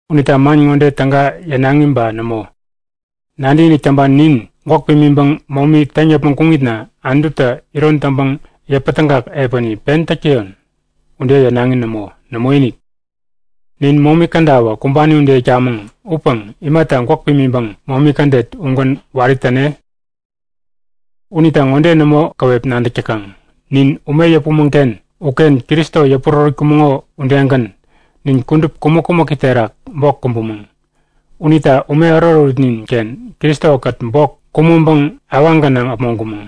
Unita man ŋode täga yänaŋi ba nämo? Nadäkinik täŋpani nin gwäk pimiŋpäŋ momi täŋ yäpmäŋ kuŋitna Anututä iron taŋpäŋ yäpätägak epäni pen täk täyon? Ude yänaŋi nämo. Nämoinik! Nin momi kädawä kumbani ude itkamäŋ upäŋ imata gwäk pimiŋpäŋ momi kädet ugän wari täne? Unita ŋode nämo käwep nadäk täkaŋ? Nin ume yäpumäŋ-ken uken Kristo yäpurärätkumäŋo udegän nin kudup kumäk-kumäki terak bok kumbumäŋ. Unita ume ärut-ärutnin-ken Kristo-kät bok kumäŋpäŋ awaŋ gänaŋ äpmoŋkumäŋ.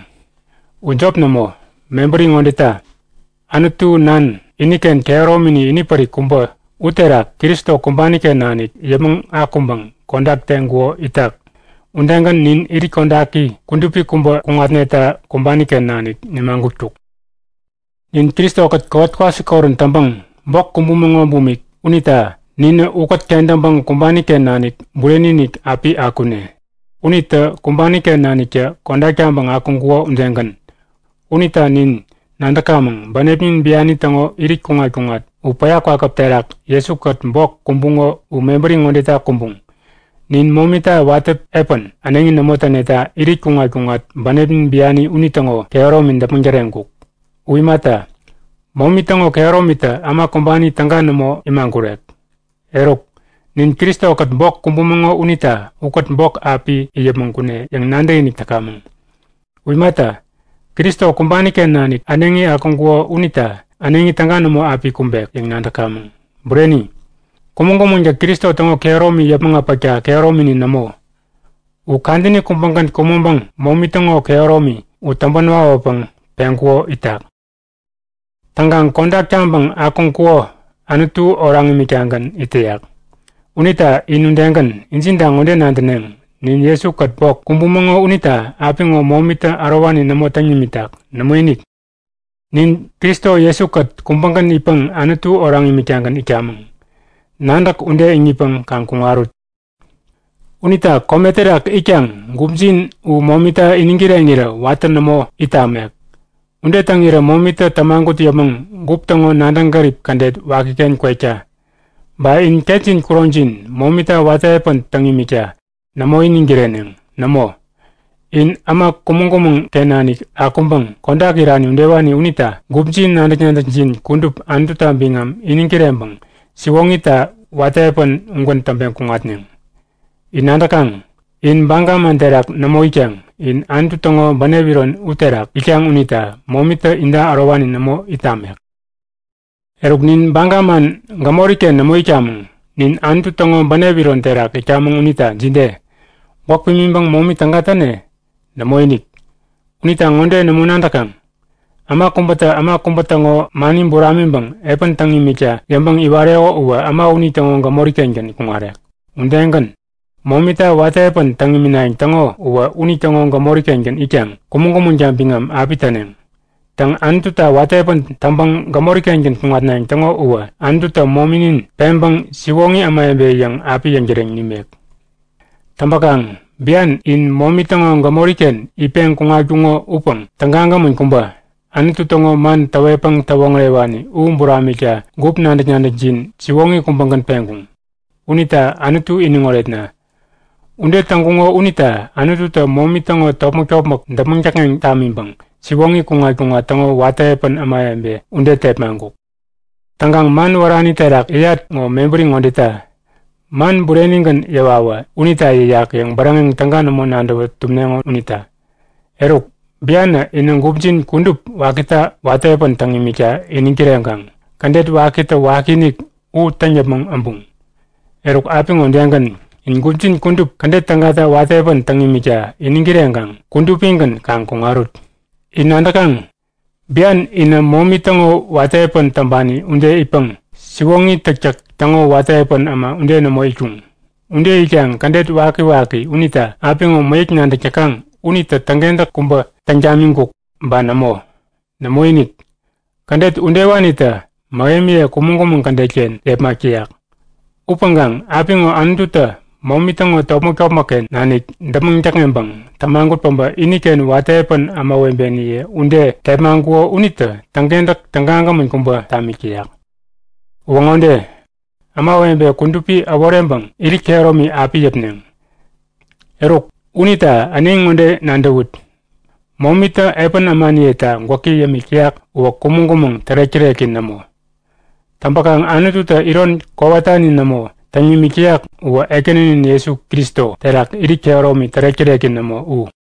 U jop nämo, mebäri ŋodeta; Anutu Nan iniken kehäromini inipärik kubä uterak Kristo kumbani-ken nanik yäpmäŋ akuŋpäŋ kodak teŋkuko itak udegän nin irit kodaki kudupi kubä kuŋatneta kumbani-ken nanik nimagutkuk. Nin Kristo-kät kowat-kwasikorän täŋpäŋ bok kumbumäŋ bumik unita ninä ukät kentäŋpäŋ kumbani-ken nanik bureni-inik api akune, unitä kumbani-ken naniktä kodak taŋpäŋ akuŋkuko udegän. Unita nin nadäkamäŋ; Bänepnin biani täŋo irit kuŋat-kuŋat u päya kwakäp terak Jesu-kät bok kumbuŋo u mebäri ŋodeta kumbuŋ; Nin momita watä epän äneŋi nämo täneta irit kuŋat-kuŋat bänepnin biani unitäŋo kehäromi däpmäŋ täreŋkuk. U imata, momi täŋo kehäromitä äma kumbani täga nämo imagurek. Eruk, nin Kristo-kät bok kumbumäŋo unita ukät bok api it yäpmäŋ kune yäŋ nadäkinik täkamäŋ. U imata, Kristo kumbani-ken nanik äneŋi akuŋkuko unita äneŋi täga nämo api kumbek yäŋ nadäkamäŋ. Bureni, kumäŋ-kumäŋtä Kristo täŋo kehäromi yäpmäŋ äpäkta kehäromini nämo. U kadäni kubägän kumäŋpäŋ momi täŋo kehäromi u täŋpän wawäpäŋ peŋkuko itak. Täŋkaŋ kodak taŋpäŋ akuŋkuko Anutu oraŋ imiktagän it täyak. Unita in udegän, injinta ŋode nadäneŋ; Nin Jesu-kät bok kumbumäŋo unita apiŋo momitä ärowani nämo täŋ nimitak. Nämoinik, nin Kristo Jesu-kät kubägän itpäŋ Anutu oraŋ imiktagän itkamäŋ. Nadäk ude iŋitpäŋ kaŋ kuŋarut. Unita kome terak itkaŋ gupjin u momita iniŋ kireŋirä watä nämo it tamek. Ude täŋirä momitä tämagut yäpmäŋ gup täŋo nadäŋ gärip kädet wakiken kwekta. Ba in ketjin kuroŋjin momita watä epän täŋ imikta nämo iniŋ kireneŋ. Nämo, in äma kumäŋ-kumäŋ-ken nanik akuŋpäŋ kodak irani udewani unita gupjin nadäk-nadäkjin kudup Anututa biŋam iniŋ kireŋpäŋ siwoŋita watä epän ugän täŋpeŋ kuŋatneŋ. In nadäkaŋ? In baga man terak nämo itkaŋ. In Anutu täŋo bänep iron uterak itkaŋ unita momitä inta ärowani nämo it tamek. Eruk nin baga man gämori-ken nämo itkamäŋ. Nin Anutu täŋo bänep iron terak itkamäŋ unita jide? Gwäk pimiŋpäŋ momi täga täne? Nämoinik! Unita ŋode nämo nadäkaŋ? Äma kubätä äma kubä täŋo mani buramiŋpäŋ epän täŋ imikta yäŋpäŋ iwareko uwä äma unitäŋo gämori-kengän kuŋarek. Udegän momita watä epän täŋ iminayäŋ täŋo uwä unitäŋo gämori-kengän itkaŋ kumäŋ-kumäŋta biŋam api täneŋ. Täŋ, Anututa watä epän täŋpäŋ gämori-kengän kuŋatnayäŋ täŋo uwä Anututä mominin peŋpäŋ siwoŋi ämawebe yäŋ api yäŋtäreŋ nimek. Täŋpäkaŋ bian in momi täŋo gämori-ken itpeŋ kuŋatkuŋo upäŋ tägagämän kubä, Anutu täŋo man täwetpäŋ täwoŋärewani u buramikta gup nadäk-nadäkjin siwoŋi kubägän peŋkuŋ. Unita Anutu iniŋ oretna! Ude täŋkuŋo unita Anututä momi täŋo topmäk-topmäk däpmäŋ däkŋeŋ tamiŋpäŋ siwoŋi kuŋat-kuŋat täŋo watä epän ämawebe ude tepmaŋkuk. (Täŋkaŋ man wärani terak yäyat ŋo mebäri ŋodeta; Man burenigän yäwawä unita yäyak yäŋ bäräŋeŋ täga nämo nadäwä tumneŋo unita.) Eruk, bianä inä gupjin kudup wakita watä epän täŋ imikta iniŋ kireŋkaŋ kädet wakitä wakiinik u täŋ yäpmäŋ äbuŋ. Eruk apiŋo udegän, in gupjin kudup kädet tägata watä epän täŋ imikta iniŋ kireŋkaŋ kudupigän kaŋ kuŋarut. In nadäkaŋ? Bian inä momi täŋo watä epän täŋpani ude itpäŋ siwoŋi täktäk täŋo watä epän äma ude nämo itkuŋ. Ude itkaŋ kädet wakiwaki unita apiŋo mäyäk nadäk täkaŋ unitä täŋkentäk kubä täŋ tamiŋkuk ba nämo? Nämoinik, kädet udewanitä mähemiye kumäŋ-kumäŋ kädet-ken yepmak täyak. Upäŋkaŋ apiŋo Anututä momi täŋo topmäk-topmäkken nanik däpmäŋ däkŋeŋpäŋ tämagut päbä iniken watä epän ämawebeniye ude tepmaŋkuko unitä täŋkentäk tägagämän kubä tamik täyak. Uwä ŋode; Ämawebe kudupi äworeŋpäŋ irit kehäromi api yäpneŋ. Eruk, unita äneŋi ŋode nadäwut; Momitä epän ämaniyeta gwäki yämik täyak uwä kumäŋ-kumäŋ tärek-täreki nämo. Täŋpäkaŋ Anututä iron kowatani nämo täŋ nimik täyak uwä Ekäninin Jesu Kristo terak irit kehäromi tärek-täreki nämo u.